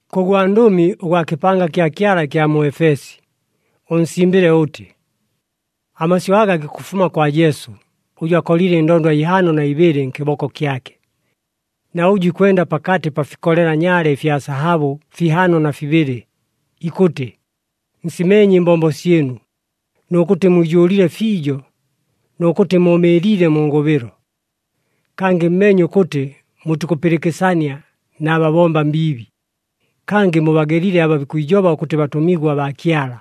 “Kʉ gwandʉmi ʉgwa kɨpanga kya Kyala ɨkya mu Efesi, ʉnsimbɨle ʉtɨ: Amasyʉ aga gikʉfuma kwa Jesu, ʉjʉ akolile ɨndondwa ihaano na ibɨlɨ nkɨboko kyake, na ʉjʉ ikwenda pakatɨ pa fikolela nyaale ɨfya sahabʉ fihaano na fibɨlɨ, ikʉtɨ: Nsimeenye ɨmbombo syɨnu, nʉ kʉtɨ mwijʉʉlile fiijo, nʉ kʉtɨ mʉʉmɨɨliile mu ngʉbɨlo. Kangɨ mmeenye ʉkʉtɨ mutikʉpɨlɨkɨsania na babomba mbiibi, kangɨ mubagelile aba bikwijoba ʉkʉtɨ batʉmigwa baa Kyala,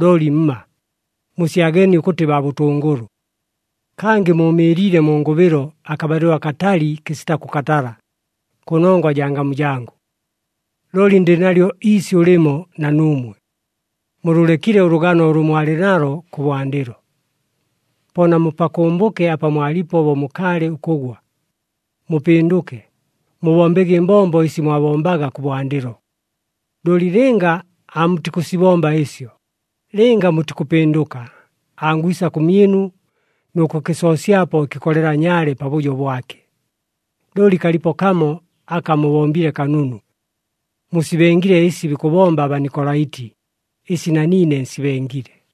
looli mma. Musyageenie ʉkʉtɨ baa bʉtʉngʉlʉ. Kangɨ mʉʉmɨɨliile mu ngʉbɨlo akabalɨlo akatali kɨsita kʉkatala, kʉnongwa jaa ngamu jangʉ. Looli ndɨ nalyo iisyʉ lɨmo na nuumwe. Mulʉlekile ʉlʉgano ʉlʉ mwalɨ nalo kʉbwandɨlo. Po namupakʉmbʉke apa mwalipo bo mukaalɨ ʉkʉgwa. Mupɨndʉke, mubombege ɨmbombo ɨsi mwabombaga kʉbwandɨlo. Looli lɨnga aamutikʉsibomba ɨsyo, lɨnga mutikʉpɨndʉka, angwisa kʉmyɨnu nʉ kʉkɨsoosyapo ɨkɨkolela nyaale pabʉjo bwake. Looli kalipo kamo aka mubombile kanunu. Musibengile ɨsi bikʉbomba aBanikolaiti, ɨsi na niine nsibengile.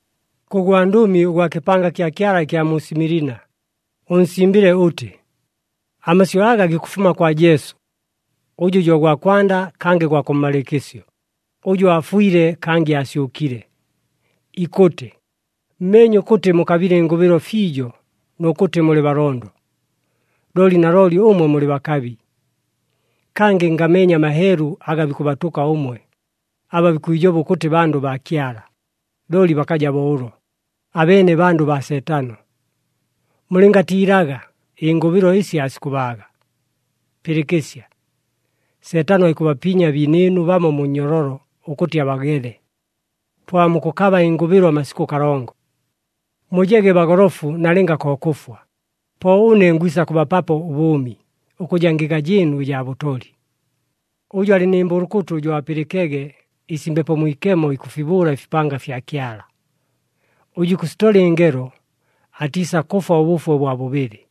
“Kʉ gwandʉmi ʉgwa kɨpanga kya Kyala ɨkya mu Similina, ʉnsimbɨle ʉtɨ: Amasyʉ aga gikʉfuma kwa Jesu, ʉjʉ jo gwa kwanda kangɨ gwa kʉmmalɨɨkɨsyo, ʉjʉ aafwile kangɨ aasyʉkile, ikʉtɨ: Mmeenye ʉkʉtɨ mukabile ɨngʉbɨlo fiijo nʉ kʉtɨ mulɨ balondo. Looli nalooli ʉmwe mulɨ bakabi. Kangɨ ngameenye amaheelu aga bikʉbatʉka ʉmwe, aba bikwijoba ʉkʉtɨ bandʉ baa Kyala, looli bakaja bo ʉlo, abeene bandʉ baa Seetano. Mulɨngatiilaga ɨngʉbɨlo ɨsi aasikʉbaaga. Pɨlɨkɨsya! Seetano aikʉbapinya abiinɨɨnu bamo mu nnyololo ʉkʉtɨ abagele, po aamukʉkaba ɨngʉbɨlo amasikʉ kalongo. Mujege bagolofu nalɨnga ko kʉfwa, po ʉne ngwisa kʉbapapo ʉbʉʉmi, ʉkʉja ngɨga jɨɨnu ɨjaa bʉtoli. Ʉjʉ alɨ nɨ mbʉlʉkʉtʉ, jo apɨlɨkege ɨsi Mbepo Mwikemo ikʉfibʉʉla ɨfipanga fya Kyala. Ʉjʉ ikʉsitola ɨngelo atiisakʉfwa ʉbʉfwe ʉbwa bʉbɨlɨ.”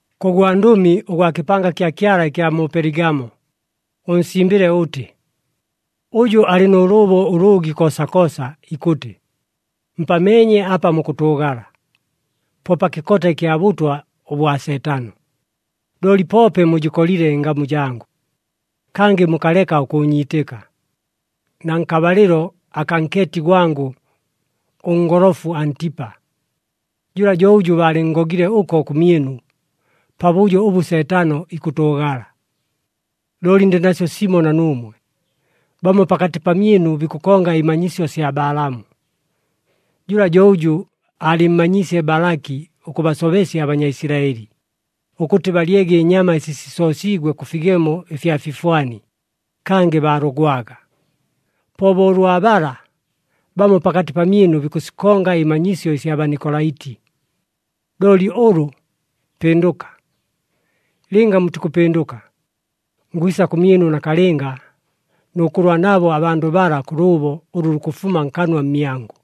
“Kʉ gwandʉmi ʉgwa kɨpanga kya Kyala ɨkya mu Peligamo, ʉnsimbɨle ʉtɨ: Ʉjʉ alɨ nʉ lʉʉbo ʉlʉʉgi koosakoosa ikʉtɨ: Mpameenye apa mukʉtʉʉgala, po pa kɨkota ɨkya bʉtwa ʉbwa Seetano. Looli poope mujɨkolile ɨngamu jangʉ, kangɨ mukaleka ʉkʉʉnyiitɨka, na nkabalɨlo akaa nkeeti gwangʉ, ʉngolofu Antipa. Jʉla jo ʉjʉ baalɨnngogile ʉko kʉmyɨnu, pabʉjo ʉbʉ Seetano ikʉtʉʉgala. Looli ndɨ nasyo simo na nuumwe. Bamo pakatɨ pamyɨnu bikʉkonga ɨmanyisyo sya Balaamu. Jʉla jo ʉjʉ aalɨmmanyiisye Balaki ʉkʉbasobesya aBanyaisilaɨli, ʉkʉtɨ balyege ɨnyama ɨsi sisoosiigwe kʉ figemo ɨfya fifwani, kangɨ baalogwaga. Po bo ʉlwa bala, bamo pakatɨ pamyɨnu bikʉsikonga ɨmanyisyo ɨsya Banikolaiti. Looli ʉlʉ, pɨndʉka! Lɨnga mutikʉpɨndʉka, ngwisa kʉmyɨnu nakalɨnga, nʉ kʉlwa nabo abandʉ bala kʉ lʉʉbo ʉlʉ lukʉfuma nkanwa mmyangʉ.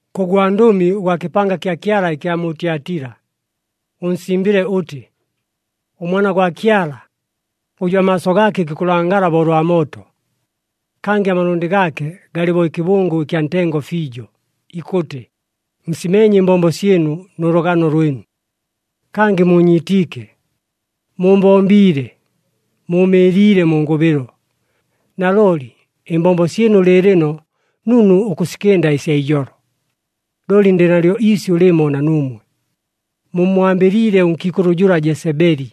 “Kʉ gwandʉmi ʉgwa kɨpanga kya Kyala ɨkya mu Tyatila, ʉnsimbɨle ʉtɨ: ɄMwana gwa Kyala, ʉjʉ amaaso gaake gikʉlangala bo ʉlwa mooto, kangɨ amalʉndɨ gaake galɨ bo ɨkɨbʉngʉ ɨkya ntengo fiijo, ikʉtɨ: Nsimeenye ɨmbombo syɨnu nʉ lʉgano lwɨnu, kangɨ muunyiitiike, muumbombiile, mʉʉmɨɨliile mu ngʉbɨlo. Nalooli ɨmbombo syɨnu lɨɨlɨno nunu ʉkʉsikɨnda ɨsya ijolo. Looli ndɨ nalyo iisyʉ lɨmo na nuumwe. Mummwambɨliile ʉnkiikʉlʉ jʉla Jesebeli,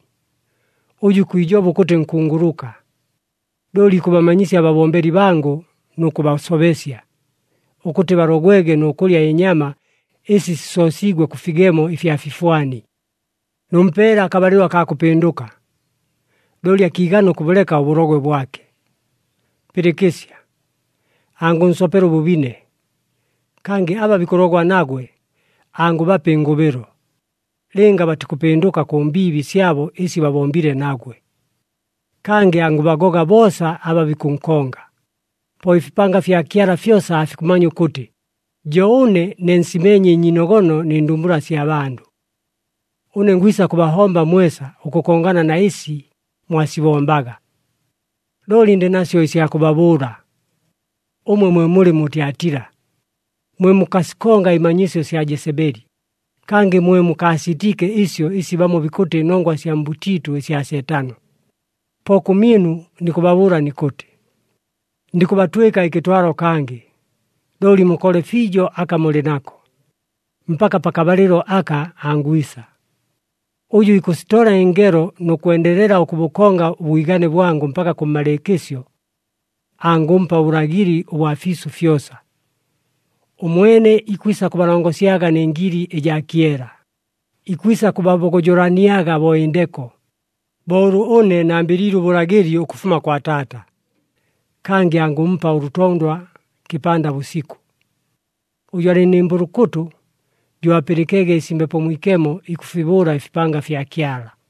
ʉjʉ ikwijoba ʉkʉtɨ nkunguluka. Looli ikʉbamanyisya ababombeli bangʉ nʉ kʉbasobesya, ʉkʉtɨ balogwege nʉ kʉlya ɨnyama ɨsi sisoosiigwe kʉ figemo ɨfya fifwani. Nʉmpeele akabalɨlo akaa kʉpɨndʉka, looli akiigana ʉkʉbʉleka ʉbʉlogwe bwake. Pɨlɨkɨsya! Angʉnsopela ʉbʉbine. Kangɨ aba bikʉlogwa nagwe angʉbapa ɨngʉbɨlo, lɨnga batikʉpɨndʉka kʉ mbiibi syabo ɨsi babombile nagwe. Kangɨ angʉbagoga boosa aba bikʉnkonga, po ɨfipanga fya Kyala fyosa aafikʉmanya ʉkʉtɨ jo ʉne ne nsimeenye ɨnyiinogono nɨ ndumbula sya bandʉ. Ʉne ngwisa kʉbahomba mwesa ʉkʉkongana na ɨsi mwasibombaga. Looli ndɨ nasyo ɨsya kʉbabʉʉla, ʉmwe mwe mulɨ mu Tyatila, mwe mukasikonga ɨmanyisyo sya Jesebeli, kangɨ mwe mukaasiitiike ɨsyo ɨsi bamo bikʉtɨ nongwa sya mbʉtiitʉ ɨsya Seetano. Po kʉmyɨnu nikʉbabʉʉla nikʉtɨ, ndikʉbatwɨka ɨkɨtwalo kangɨ. Looli mukole fiijo aka mulɨ nako, mpaka pakabalɨlo aka angwisa. Ʉjʉ ikʉsitola ɨngelo nʉ kwendelela ʉkʉbʉkonga ʉbwigane bwangʉ mpaka kʉmmalɨɨkɨsyo, ‘Angʉmpa ʉbʉlagɨli ʉbwa fiisʉ fyosa. Ʉmwene ikwisa kʉbalongosyaga nɨ ngili ɨjaa kyela, ikwisa kʉbabogojolaniaga bo ɨndeko,’ bo ʉlʉ ʉne nambɨliile ʉbʉlagɨli ʉkʉfuma kwa Taata. Kangɨ angʉmpa ʉlʉtondwa kɨpanda bʉsikʉ. Ʉjʉ alɨ nɨ mbʉlʉkʉtʉ, jo apɨlɨkege ɨsi Mbepo Mwikemo ikʉfibʉʉla ɨfipanga fya Kyala.”